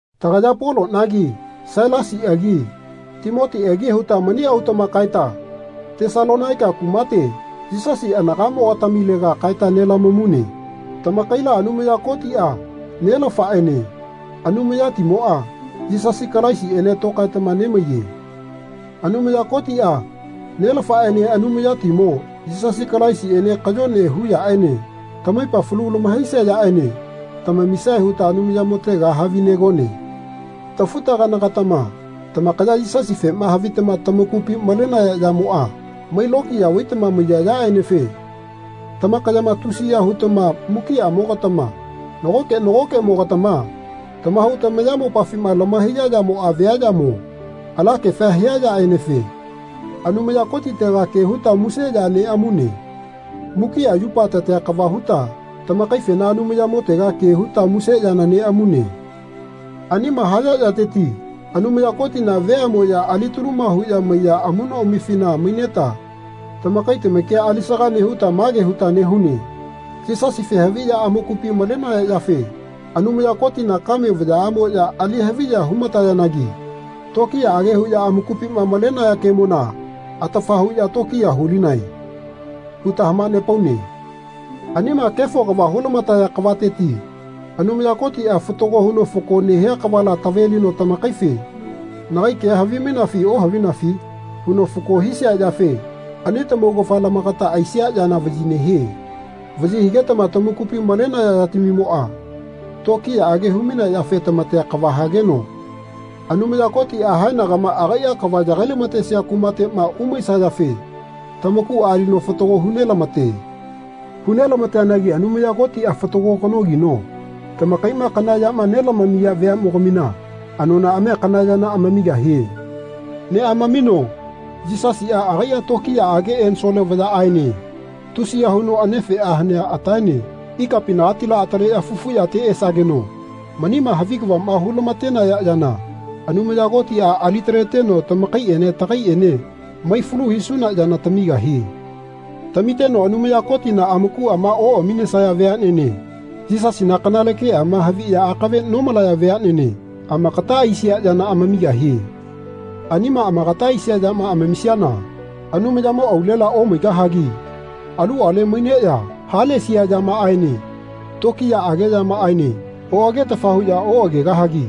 Tagaya Polonagi Sailasiagi Timotiagi huta mani autama kaeta Tesalonaika kumate Yisasi anagamogatamilega kaeta nelamamune. Tamakaila Anumaya Kotia, Nelafaene Anumayatimoa, Yisasi Kalaisiene tokaetama nemaiye. Anumaya Kotia, Nelafaene Anumayatimo, Yisasi Kalaisiene kayone hu yaene tamaipa falu lamahaisia yaene tamamisae huta Anumayamotega havinegone. Tafu-tagana-gatama tamakaya Yisasifema havitama tamakupi malenaya yamoa mai lokiya vaitama maiya yaenefe tamakayama tusiya hutama mukiamogatama nagoke nagokemogatama tamahau tamayamopafima lamahaiya yamoa via yamo alakefa hia yaenefe Anumaya Kotitega ke huta muse ya neamune. Mukia yupa tatea kava huta tamakaifena Anumayamotega ke huta muse yana neamune. Aniama haya yateti Anumaya Kotina veamoya alitaluma huya maiya amunoamifina maineta tamakai tamakia alisaga nehuta mage huta nehune Yisasife haviya amakupi malenaya yafe Anumaya Kotina kame vayaamoya ali haviya humatayanagi tokiyaage huya amakupima malenaya kemona atafa huya tokiya hulinae. huta hamanepaune. Anima kefo kava hulamataya kavateti Anumaya Kotia fatago huno fako nehia kavala tavelino tamakaife Nagai kea havimainafi ohavinafi? huno fako hisia yafe ani tamaugafa lamakata aisia yana vayi nehie. Vayi higetama tamakupi malenaya yatamimoa tokiyaage humainea yafe tamatea kava hageno Anumaya Kotia haenagama agaia kava yagai-lamatesia kumatema umaisayafe tamakua alino fatago hu nelamate. Hu nelamateanagi Anumaya Kotia fatago kanogino tamakaima kana yama nelamamiya veamogamina anonaamia kana yana amamigahie. Neamamino Yisasia agaia tokiyaage ensole vayaaene tusiya huno anefea hanea ataene ikapinagatila ataleya fufu yate esageno manima havi kavama hulamatenaya yana Anumaya Kotia alitaleteno tamakaiene tagaiene mai falu hisuna yana tamigahie. Tamiteno Anumaya Kotina amakuama oaminesaya veanene Yisasina kanale keama haviya akave nomalaya veanene amakata aisia yana amamigahie. Anima amagata aisia yama amamisiana Anumayamo aulela omaigahagi aluale maineya halesia yamaaene tokiyaage yamaaene oagetafa huya oagegahagi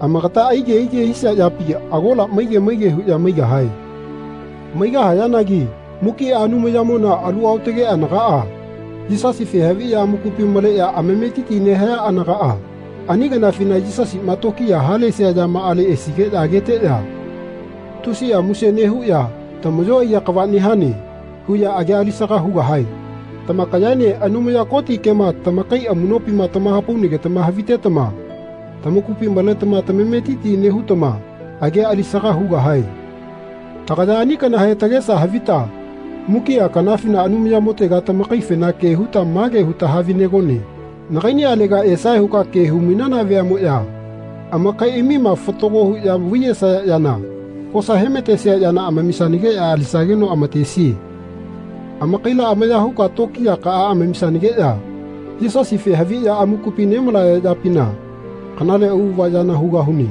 amakata aige aige hisia yapi agola maige maige huya maigahae. Maigahayanagi mukia Anumayamona alu aotage anagaa Yisasife haviya amakupi maleya amametiti nehaya anagaa ani kanafina Yisasima tokiya halesia yamaale esigeya ageteya tusia muse nehuya Tamayo aiya kava nehane. huya agia alisaga hugahae. Tamakayaene Anumaya Koti kema tamakai amunopima tamahapaunagetama havitetama tamakupi maletama tamametiti nehutama agia alisaga hugahae. Tagaya ani kanahe tagesa havita mukia kanafina Anumayamotega tamakaifena ke huta mage huta havinegone Nagainialega esae huka ke humainana veamoya amakaiamima fatago huya vaiyesaya yana kosa hematesia yana amamisanageya alisageno amatesie. Amakaila amaya huka tokiyakaa amamisanageya Yisasife haviya amakupi nemalaya yapina Kanale auava yana hugahune.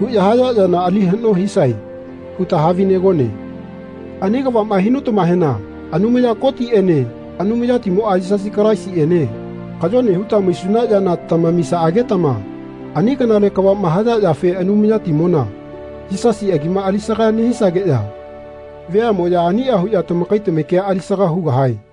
huya haya yana ali hano hisae. huta havinegone. Ani kavama hinutamahena Anumaya Kotiene Anumayatimoa Yisasi Kalaisiene kayone huta maisuna yana tamamisaagetama ani kanale kavama haya yafe Anumayatimona, Yisasi agima alisaga nehisageya veamoya ania huya tamakai tamakia alisaga hugahae.